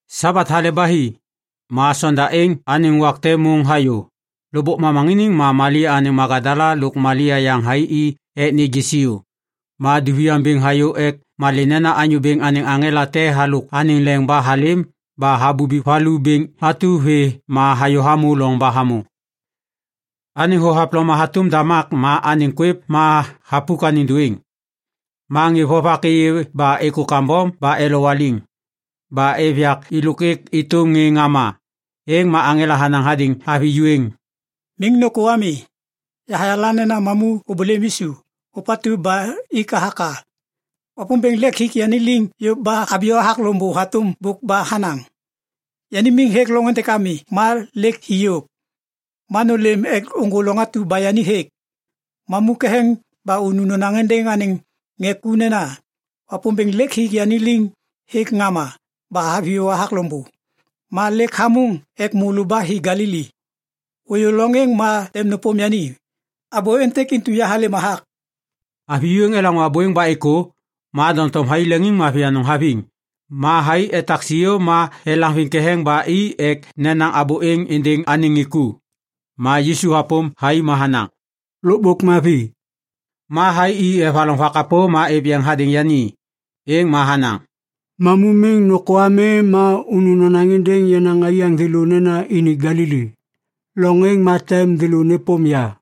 Sabat hale ba hi. Ma sonda êŋ anêŋ wak te môŋ hayô. Lôkbôk momaŋiniŋ ma Malia anêŋ Magadala lôk Malia yaŋ thai i ek nêgê siô. Ma duviaŋ bêŋ hayô ek malê nena Anyô Bêŋ anêŋ aŋela te halôk anêŋ leŋ ba halêm ba habubi valu bêŋ atu vê ma hayô hamô loŋ ba hamô. Anêŋ thohavloma hatôm damak ma anêŋ kwêv ma thapuk anêŋ dôêŋ. Ma ŋê vovak êyê ba êkô kambom ba elowaliŋ. Ba êv yak êlôk êk êtôm ŋê ŋama. Êŋ ma aŋela hanaŋ hadêŋ avi ju êŋ, “Miŋ nôkô ami. Yahayala nena mamu ôbôlêm Yisu, ôpatu ba ik hathak a. Wapômbêŋ lêk hik yani liŋ yôv ba haviyô hathak loŋbô hatôm bôk ba hanaŋ. Yani miŋ hêk loŋ êntêk ami ma lêk hi yôv. Ma nôlêm ek ôŋgô loŋ atu ba yani hêk. Mamu ketheŋ ba unu nonaŋ êndêŋ anêŋ ŋê ku nena, ‘Wapômbêŋ lêk hik yani liŋ hêk ŋama ba haviyô hathak loŋbô. Ma lêk hamôŋ ek môlô ba hi Galili. Ôyô loŋ êŋ ma tem nôpôm yani.’ Abô êntêk intu yahalêm hathak.” Avi ju êŋ elaŋô abô êŋ ba êkô, ma doŋtom thai leŋiŋmavi anôŋ haviŋ. Ma thai etak siô ma elaŋviŋ ketheŋ ba i ek nenaŋ abô êŋ êndêŋ anêŋ ŋê ku. Ma Yisu hapôm thai ma hanaŋ, “Lôkbôk mavi.” Ma thai i evaloŋ vakapô ma êv yeŋ hadêŋ yani. Êŋ ma hanaŋ, “Mamu miŋ nôkô ami ma unu nonaŋ êndêŋ yenaŋ aiyaŋ thêlô nena ini Galili. Loŋ êŋ ma tem thêlô nêpôm ya.”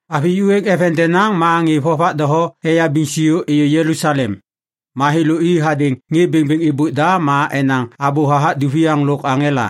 Avi ju êŋ eveŋ denaŋ ma ŋê vovak doho eyabiŋ siô êyô Jelusalem. Ma thêlô i hadêŋ ŋê bêŋbêŋ êbôk da ma enaŋ abô hathak duviaŋ lôk aŋela.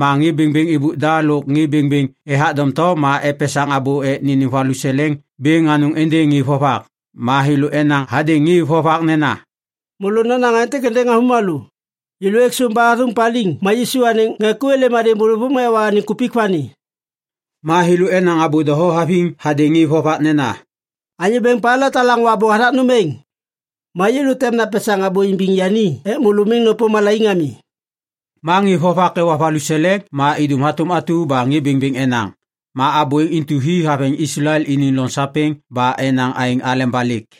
Ma ŋê bêŋbêŋ êbôk da lôk ŋê bêŋbêŋ ethak doŋtom ma epesaŋ abô ek nênêm valuseleŋ bêŋ anôŋ êndêŋ ŋê vovak. Ma thêlô enaŋ hadêŋ ŋê vovak nena, “Môlô nonaŋ aêntêk êndêŋ avômalô, ‘Yêlô ek sôm ba athôŋ paliŋ ma Yisu anêŋ ŋê ku êlêm hadêŋ bôlôvôŋ ma ewa anêŋ kupik vani.’” Ma thêlô enaŋ abô doho haviŋ hadêŋ ŋê vovak nena, “Anyô bêŋ Pailat halaŋô abô hathak nôm êŋ, ma yêlô tem napesaŋ abô imbiŋ yani ek môlô miŋ nôpôm malaiŋ ami.” Ma ŋê vovak ewa valuseleŋ ma idum hatôm atu ba ŋê bêŋbêŋ enaŋ. Ma abô êŋ intu hi haveŋ Islael iniŋ loŋ sapêŋ ba enaŋ aêŋ aleba lêk.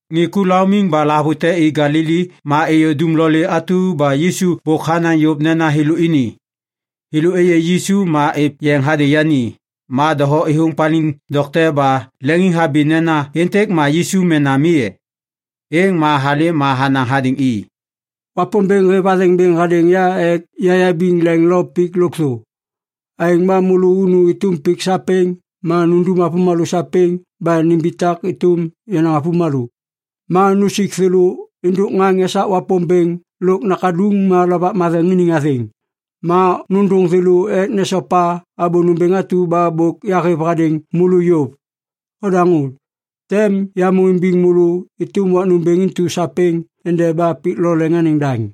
Ŋê ku laumiŋ ba lahavute i Galili ma êyô dumlolê atu ba Yisu bôk hanaŋ yôv nena thêlô ini. Thêlô êyê Yisu ma êv yeŋ hadêŋ yani. Ma doho êthôŋ paliŋ dokte ba leŋiŋhabi nena, “Êntêk ma Yisu mena mi e?” Êŋ ma halêm ma hanaŋ hadêŋ i, “Wapômbêŋ hêv athêŋ bêŋ hadêŋ ya ek yayabiŋ leŋ lôk pik lôkthô. Aêŋ ba môlô unu êtôm pik sapêŋ ma nundum avômalô sapêŋ ba nimbitak êtôm yenaŋ avômalô. Ma nusik thêlô êndôk ŋaŋ esak Wapômbêŋ lôk Nakaduŋ ma Lovak Matheŋ iniŋ athêŋ. Ma nôndôŋ thêlô ek nesopa abô nômbêŋ atu ba bôk yahêv hadêŋ môlô yôv. Odaŋô! Tem yamô imbiŋ môlô êtôm wak nômbêŋ intu sapêŋ endeba pik lo leŋ anêŋ daŋ.”